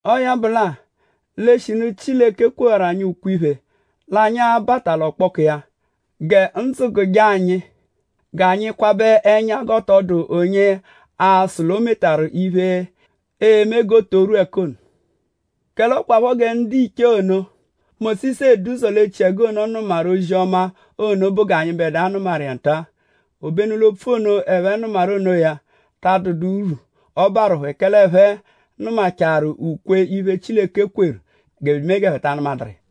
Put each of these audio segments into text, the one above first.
Ọo ya bụ lẹ-a; l'eshinu Chileke kwewaru anyi ukwe-iphe l'anyi a-bata l'ọkpoku iya; gẹ ndzụ gụje anyi g'anyi kwabẹ ẹnya g'ọ tọ dụ onye aa-sụ l'o metaru iphe, e-me g'o to rwu ẹka ono. Kẹle ọ kwaphọ gẹ ndiche ono, Mósisu edu ụzo l'echiẹgu ono nụmaru ozi-ọma ono bụ g'anyịbedua nụmaru iya nta-a. Obenu l'opfu ono, ẹphe nụmaru onoya ta adụdu urwu, ọ barụ phẹ; kẹle ẹphe nụmachaaru ukwe-iphe, Chileke kweru bya emee g'ẹphe ta anụmaduru iya.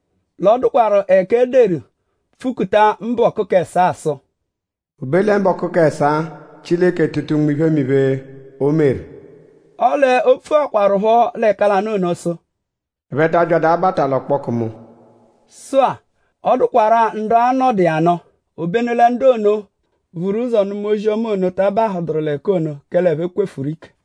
L'ọ dụkwaru ẹka e deru pfukuta mbọku k'ẹsaa sụ: “O be lẹ mbọku k'ẹsaa; Chileke tụta unme iphemiphe, o meru.” Ọle o pfukwarụpho l'ẹka lanụ ono sụ: “Ẹphe ta abyadụ abata l'ọkpoku mu.” Sụ-a; ọ dụkwarua ndu a-nọdu iya nụ; obenu lẹ ndu ono, vuru ụzo nụma ozi-ọma ono ta abahụduru l'ẹka ono; kẹle ẹphe kwefuru ike.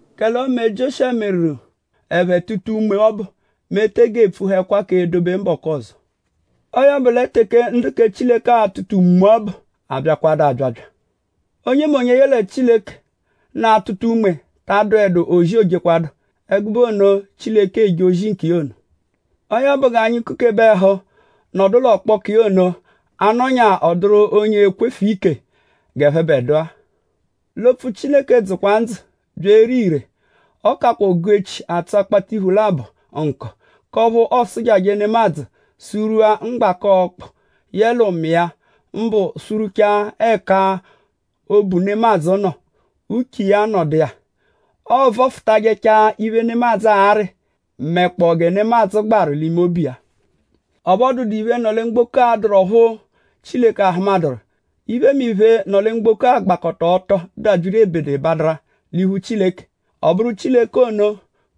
Kẹle ọme Jioshuwa meru ẹphe tụta unme ọbu; mẹ e tege epfuhẹkwa k'edobe mbọku ọzo. Ọo ya bụ lẹ teke ndu kẹ Chileke a-tụta unme ọbu abyakwadu abyabya. Onyemonye, yẹle Chileke nọ atụta unme bẹ ta adụedu ozi, oojekwadụ; ẹgube ono, Chileke eje ozi nkiya ono. Ọo ya bụ; g'anyi kukebe ẹhu nọdu l'ọkpoku iya ono; a -nọnya ọ dụru onye ekwefu ike g'ẹphebedua. L'opfu Chileke dzụkwa ndzụ bya ere ire. Ọ kakwa ogu-echi, atsụ akpatiphu labọ atsụ nkọ; k'ọphu ọosujaje nemadzụ sụ-rwua mgbaka ọkpu yẹe ụmi iya; mbụ sụ-rwuchaa ẹka obu nemadzụ nọ; uche iya nọdu iya. Ọovofutajechaa iphe, nemadzụ arị mẹkpoo gẹ nemadzụ gbaru l'ime obu iya. Ọphu ọ dụdu iphe, nọ lẹ mgboko, dụru ọphu Chileke ahụmaduru. Iphemiphe, nọ lẹ mgboko gbakọta ọto dabyiru l'ebederebadara l'iphu Chileke. Ọ bụru Chileke ono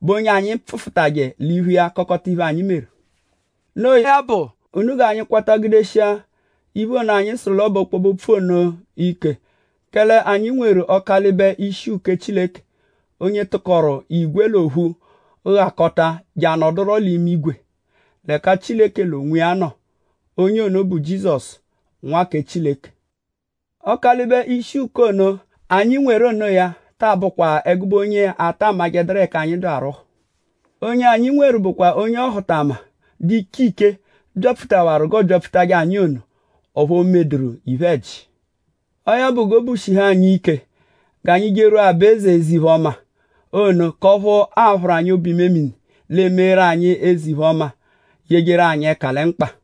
bụ onye anyi pfụfutaje l'iphu iya kọkota iphe, anyi meru. Noo ya bụ; unu g'anyi kwata gudeshia iphe ono, anyi sụru l'ọ bụ ọkpobe-opfu ono ike; kẹle anyi nweru Ọkalibe ishi uke Chileke; onye tụkoru igwe l'ophu ghakọta je anọduro l'imigwe ẹka Chileke l'onwiya nọ. Onye ono bụ Jizọsu, Nwa kẹ Chileke. Ọkalibe ishi uke Chileke ono, anyi nweru onoya ta abụkwa ẹgube onye ata amajẹduru ẹka anyi dụ arwụhu. Onye anyi nweru bụkwa onye ọhutama, dụ iche iche byapfutawaru g'ọo byapfutajẹ anyi ono; ọphu o medụru iphe-ẹji. Ọo ya bụ; g'obu shihu anyi ike g'anyi jerwua aba-eze eze-iphe-ọma ono; k'ọphu a-phụru anyi obu-imemini; l'eemeeru anyi eze-iphe-ọma yejeru anyi ẹka lẹ mkpa.